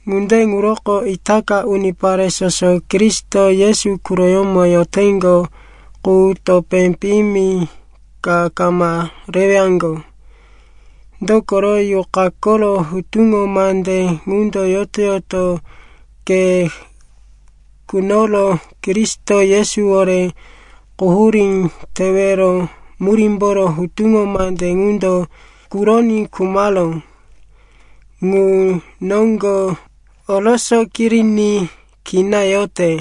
Ŋunde ŋuroko, itaka unipare soso Kristo Yesu quroyómo yoteŋgo qu topé piyimi ka kama rewaŋgo. Dokoro, Yuqa koro hutuŋo mande ŋundo yoto-yoto ke kunoro Kristo Yesuwore quhurí tewero murímboro hutuŋo mande ŋundo kuroní khumaró ŋu noŋgo oroso kiriní kina yote.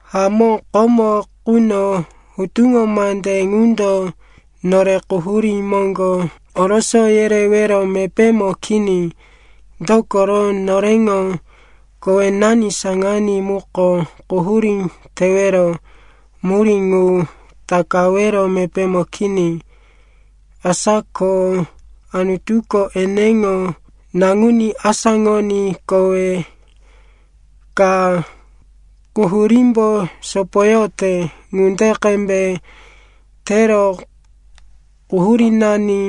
Hamó, komo quno hutuŋo mande ŋundo nore quhurí moŋgo oroso yerewero mepémo kini, dokoro noreŋo kowenani saŋaní muko quhurí tewero murí ŋu takawero mepémo kini. Asa ko Anutuko eneŋo naŋuní asáŋoní kowe ka quhurímbo sopoyote ŋunde qembe tero quhurínani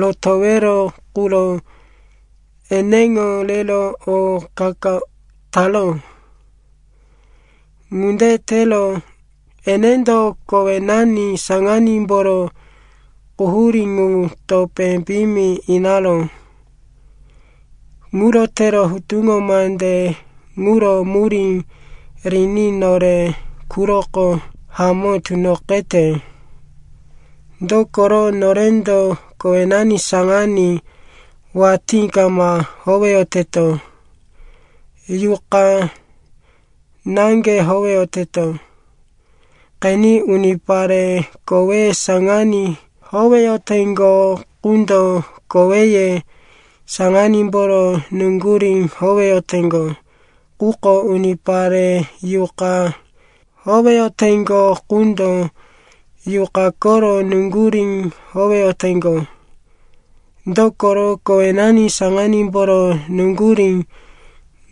rotowero quro eneŋo rero o qa-qa taró. Ŋunde tero enendo kowenani saŋanímboro quhurí ŋu topé piyimi inaró. Ŋuro tero hutuŋo mande ŋuro murí riní nore quroko hamó tunoqete, dokoro norendo kowenani saŋaní watí kama howeyoteto, Yuqa naŋge howeyoteto. Qeni, unipare koweye saŋaní howeyoteŋgo qundo koweye saŋanímboro nuŋgurí howeyoteŋgo, quko unipare Yuqa howeyoteŋgo qundo Yuqa koro nuŋgurí howeyoteŋgo. Dokoro kowenani saŋanímboro nuŋgurí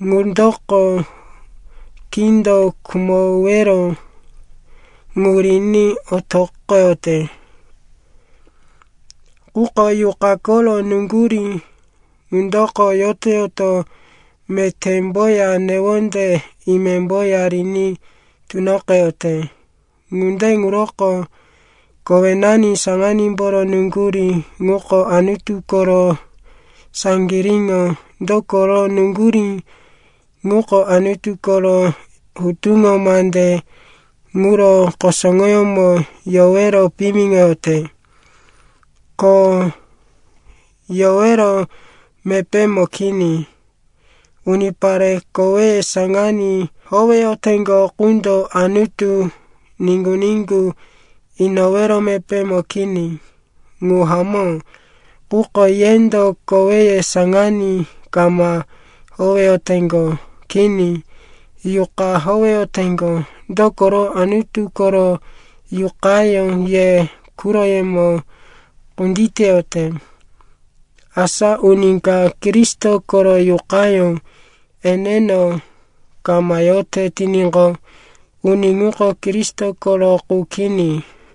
ŋundoko kindo khumowero ŋu riní otoqoyote, quko Yuqa koro nuŋgurí ŋundoko yoto-yoto metémboya newonde imemboya riní tunoqeyote. Ŋunde ŋuroko kowenani saŋanímboro nuŋgurí ŋuko Anutu koro saŋgiríŋo, dokoro nuŋgurí ŋuko Anutu koro hutuŋo mande ŋuro kusuŋoyómo yowero piyimiŋoyote, ko yowero mepémo kini. Unipare koweye saŋaní howeyoteŋgo qundo Anutu niŋgu-niŋgu inowero mepémo kini. Ŋu hamó, quko yendo koweye saŋaní kama howeyoteŋgo. Kini, Yuqa howeyoteŋgo, dokoro Anutu koro Yuqayó ye quroyemo kunditeyote. Asa uni ka Kristo koro Yuqayó eneno kama yote tiníqo, uni ŋuko Kristo koro qu kini.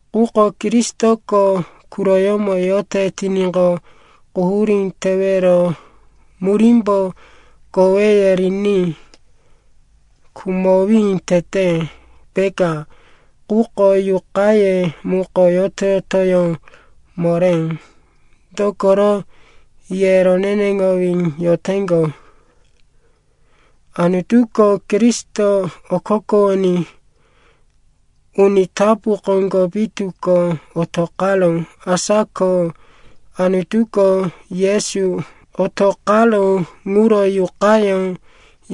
Quko Kristoko quroyemo yote tiníqo, quhurí tewero murímbo koweye riní khumowí tete, peka, quko yuqaye muko yoto-yotoyó moré, dokoro ye roneneŋowí yoteŋgo. Anutuko Kristo okokowoní uni tapu koŋgo pitu ko otoqaró. Asa ko Anutuko Yesu otoqaró ŋuro Yuqayó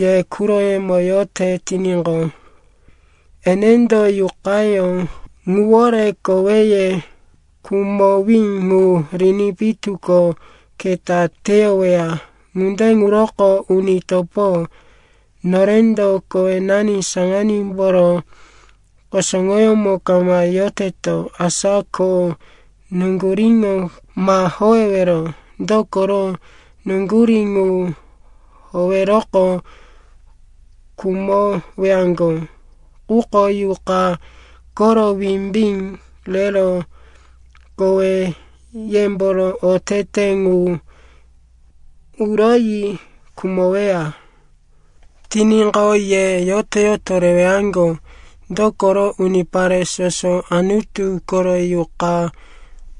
ye quroyemo yote tiníqo, enendo Yuqayó ŋuwore koweye khumowí ŋu riní pitu ko keta teyoweya. Ŋunde ŋuroko, uni topo, norendo kowenani saŋanímboro kusuŋoyómo kama yoteto, asa ko nuŋguríŋo ma howewero. Dokoro nuŋgurí ŋu howeroqo, khumowaŋgo. Quko Yuqa koro wimbí rero koweyemboro otete ŋu uroyi khumoweya tiníqo, ye yoto-yoto rewaŋgo. Dokoro unipare soso Anutu koro Yuqa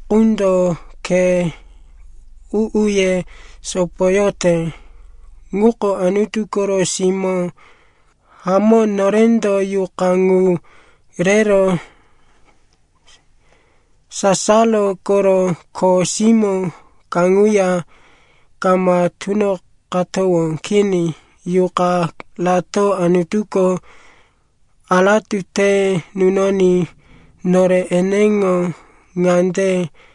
qundo khe u-uye sopoyote ŋuko Anutu koro simó. Hamó, norendo Yuqa ŋu rero sasaro koro kho simó kaŋuya kama tunoqatowó. Kini, Yuqa rato Anutuko aratu te nunoní nore eneŋo ŋande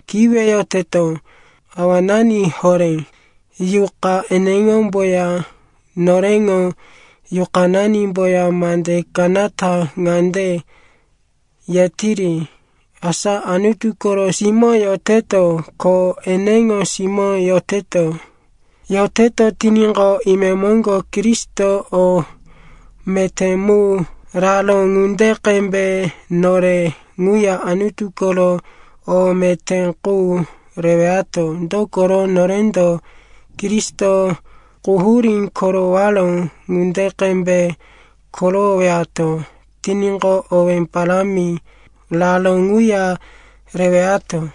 kiweyoteto, “Awanani horé.” Yuqa eneŋomboya noreŋo yuqananimboya mande kanata ŋande yetiri, asa Anutu koro simó yoteto. Ko eneŋo simó yoteto tiníqo, imemoŋgo Kristo o meté mu raró ŋunde qembe nore ŋuya Anutu koro o meté qu rewato. Dokoro, norendo Kristo quhurí korowaró ŋunde qembe korowowato tiníqo, owí parámi raró ŋuya rewato.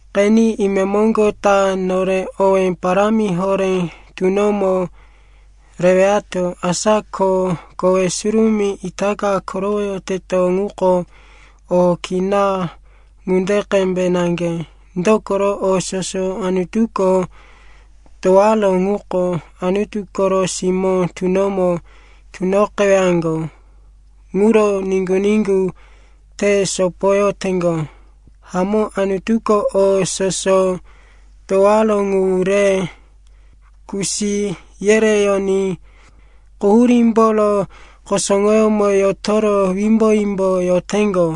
Qeni, imemoŋgo ta nore owé parámi horé tunomo rewato. Asa ko kowe surumí itaka korowoyoteto ŋuko o kina ŋunde qembe naŋge. Dokoro o soso Anutuko towaró ŋuko Anutu koro simó tunomo tunoqewaŋgo ŋuro niŋgu-niŋgu te sopoyoteŋgo. Hamó, Anutuko o soso towaró ŋu re kusi yereyoní quhurímboro kusuŋoyómo yotoro wimbo-wimbo yoteŋgo.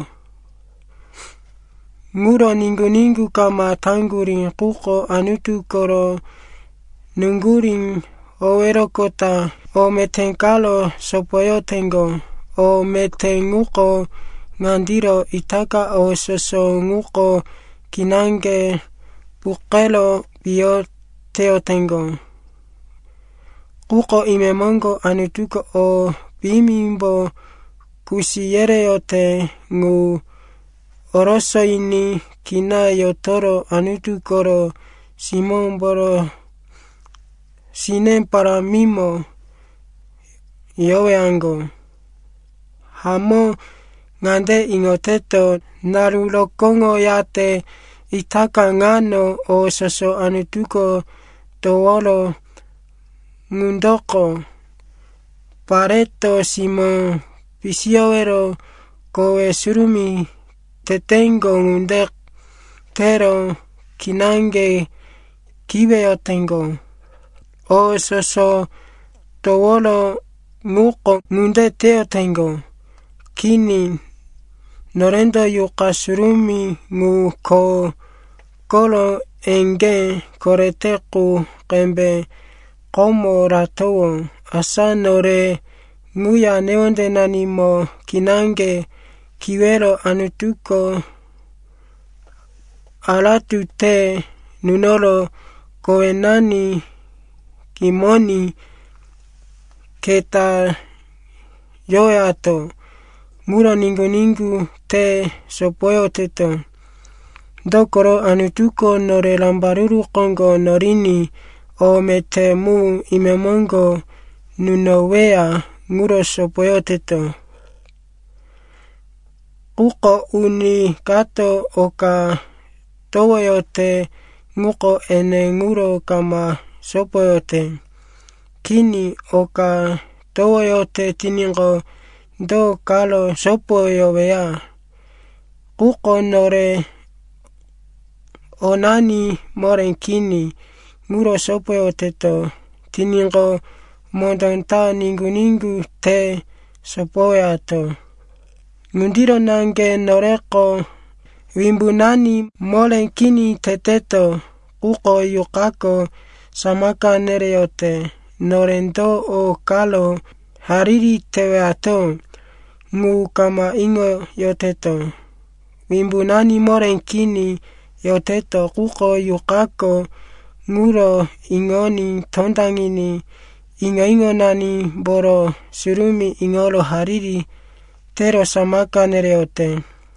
Ŋuro niŋgu-niŋgu kama taŋgurí, quko Anutu koro nuŋgurí howeroqota o meté karo sopoyoteŋgo. O meté ŋuko ŋandiro, itaka o soso ŋuko kinaŋge puqero piyo teyoteŋgo, quko imemoŋgo Anutuko o piyimimbo kusi yereyote ŋu orosoyiní kina yotoro Anutu koro simómboro sine parámimo yowaŋgo. Hamó, ŋande iŋoteto, naru rokóŋoyate itaka ŋano, o soso Anutuko towaró ŋundoko pareto simó pisiyowero kowe surumí teteŋgo ŋunde tero kinaŋge kiweyoteŋgo. O soso towaró ŋuko ŋunde teyoteŋgo, kini. Norendo Yuqa Surumí ŋu, kho koro eŋgé korete qu qembe, komo ratowó. Asa nore ŋuya newondenanimo kinaŋge kiwero Anutuko aratu te nunoro kowenani kimoní keta yowato ŋuro niŋgu-niŋgu te sopoyoteto. Dokoro Anutuko nore rambaruru koŋgo noriní o meté mu imemoŋgo nunoweya ŋuro sopoyoteto. Quko uni kato oka towoyote ŋuko ene ŋuro kama sopoyote. Kini, oka towoyote tiníqo, do karo sopoyoweya? Quko nore onani moré kini ŋuro sopoyoteto tiníqo, mondó ta niŋgu-niŋgu te sopoyowato. Ŋundiro naŋge noreko wimbunani moré kini teteto, quko Yuqako samaka nereyote. Nore do o karo hariri tewato ŋu kama iŋoyoteto. Wimbunani moré kini yoteto, quko Yuqako ŋuro iŋoní tondaŋiní iŋo-iŋonanimboro surumí iŋoro hariri tero samaka nereyote.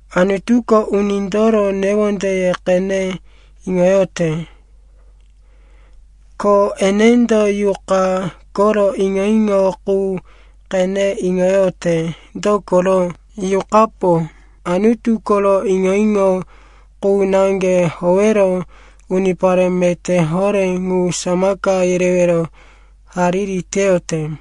Anutuko unindoro newondeye qene iŋoyote, ko enendo Yuqa koro iŋo-iŋo qu qene iŋoyote. Dokoro Yuqapo Anutu koro iŋo-iŋo qu naŋge howero unipare meté horé ŋu samaka yerewero hariri teyote.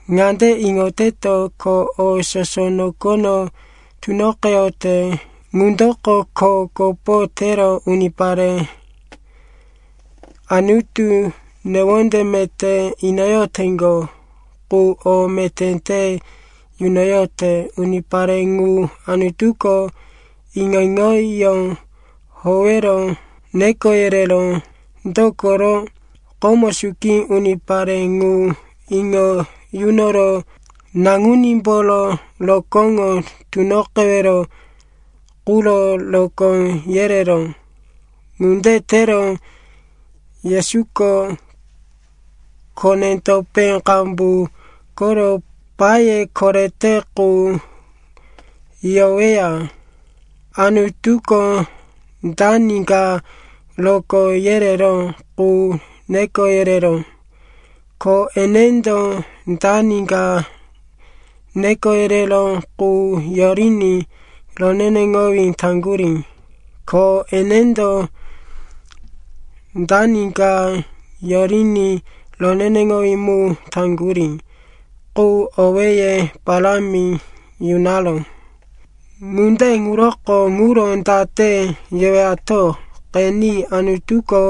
Ŋande iŋoteto, ko o soso nokono tunoqeyote ŋundoko kho kopo tero unipare Anutu newonde meté inoyoteŋgo qu o meté te yunoyote. Unipare ŋu, Anutuko iŋo-iŋoyó howero neko yereró. Dokoro komo suki unipare ŋu iŋo yunoro naŋunímboro rokóŋo tunoqewero quro rokó yereró. Ŋunde tero Yesuko kone-topé qambu koro paye korete qu yoweya. Anutuko dani ka rokó yereró qu neko yereró. Ko enendo dani ka neko yereró qu yoriní roneneŋowí taŋgurí. Ko enendo dani ka yoriní roneneŋowí mu taŋgurí qu owéye parámi yunaró. Ŋunde ŋuroko ŋuro date yewato? Qeni, Anutuko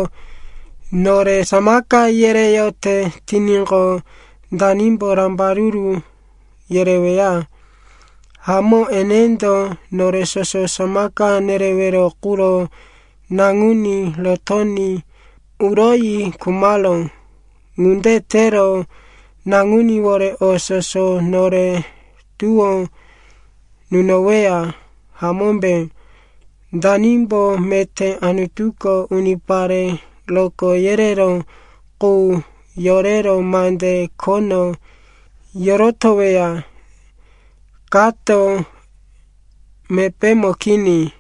nore samaka yereyote tiníqo, danimbo rambaruru yereweya? Hamó, enendo nore soso samaka nerewero quro naŋuní rotoní uroyi khumaró. Ŋunde tero naŋuníwore o soso nore tuwó yunoweya, hamómbe? Danimbo meté Anutuko unipare rokó yereró qu yorero mande khono yorotoweya? Kato mepémo kini,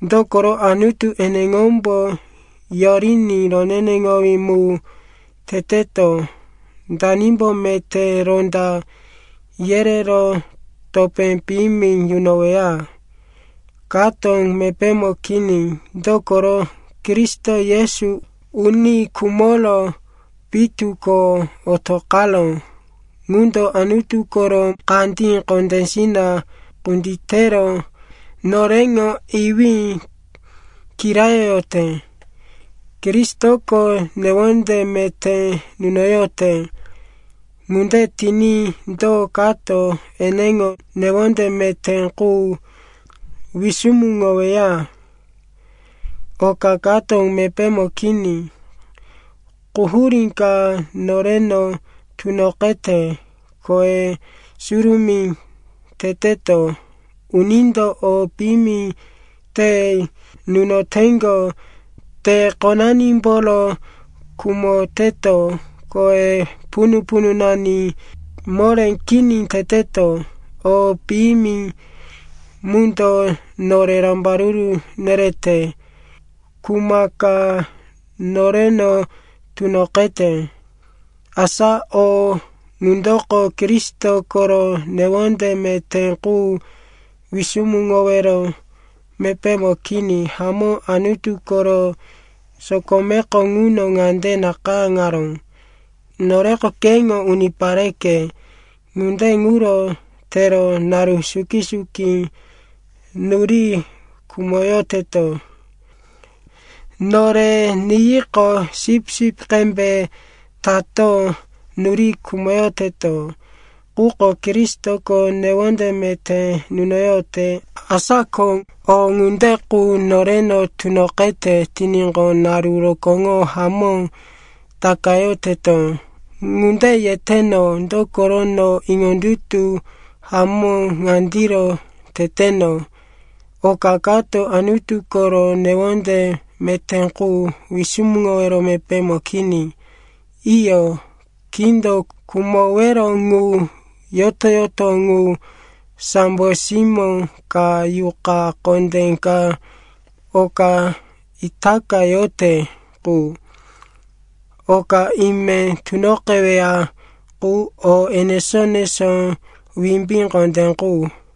dokoro Anutu eneŋombo yoriní roneneŋowí mu teteto. Danimbo meté ronda yerero topé piyimi nunoweya? Kato mepémo kini, dokoro Kristo Yesu, uni khumoro pitu ko otoqaró ŋundo Anutu koro kandí kondésina kunditero noreŋo iwí kirayoyote. Kristoko newonde meté nunoyote. Ŋunde tiní do kato eneŋo newonde meté qu wisumuŋoweya? Oka kato mepémo kini. Quhurí ka noreno tunoqete, kowe surumí teteto, unindo o piyimi te nunoteŋgo, te-qonanimboro khumoteto, kowe punu-pununani moré kini teteto, o piyimi mundo nore rambaruru nerete, kuma ka noreno tunoqete, asa o ŋundoko Kristo koro newonde meté qu wisumuŋowero mepémo kini. Hamó, Anutu koro sokomeko ŋuno ŋande nakayáŋaró, “Noreko keŋo unipareke, ŋunde ŋuro tero naru suki-suki nuri khumoyoteto. Nore niyiqo sipsip qembe tato nuri khumoyoteto.” Quko Kristoko newonde meté nunoyote. Asa ko o ŋunde qu noreno tunoqete tiníqo, naru rokóŋo hamó takayoteto. Ŋunde yeteno, dokoro no iŋondutu hamó ŋandiro teteno. Oka kato Anutu koro newonde meté qu wisumuŋowero mepémo kini. Iyo, kindo khumowero ŋu, yoto-yoto ŋu, sambo simó ka, yuqa kondé ka, oka itaka yote qu, oka ime tunoqeweya qu, o enesó-enesó wimbí kondé qu,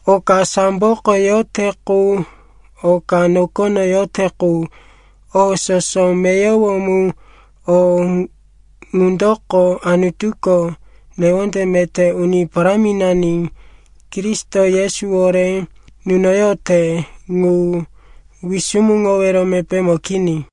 oka samboko yote qu, oka nokono yote qu, o soso meyowo mu, o ŋundoko Anutuko newonde meté Uni Paráminani Kristo Yesuwore nunoyote ŋu wisumuŋowero mepémo kini.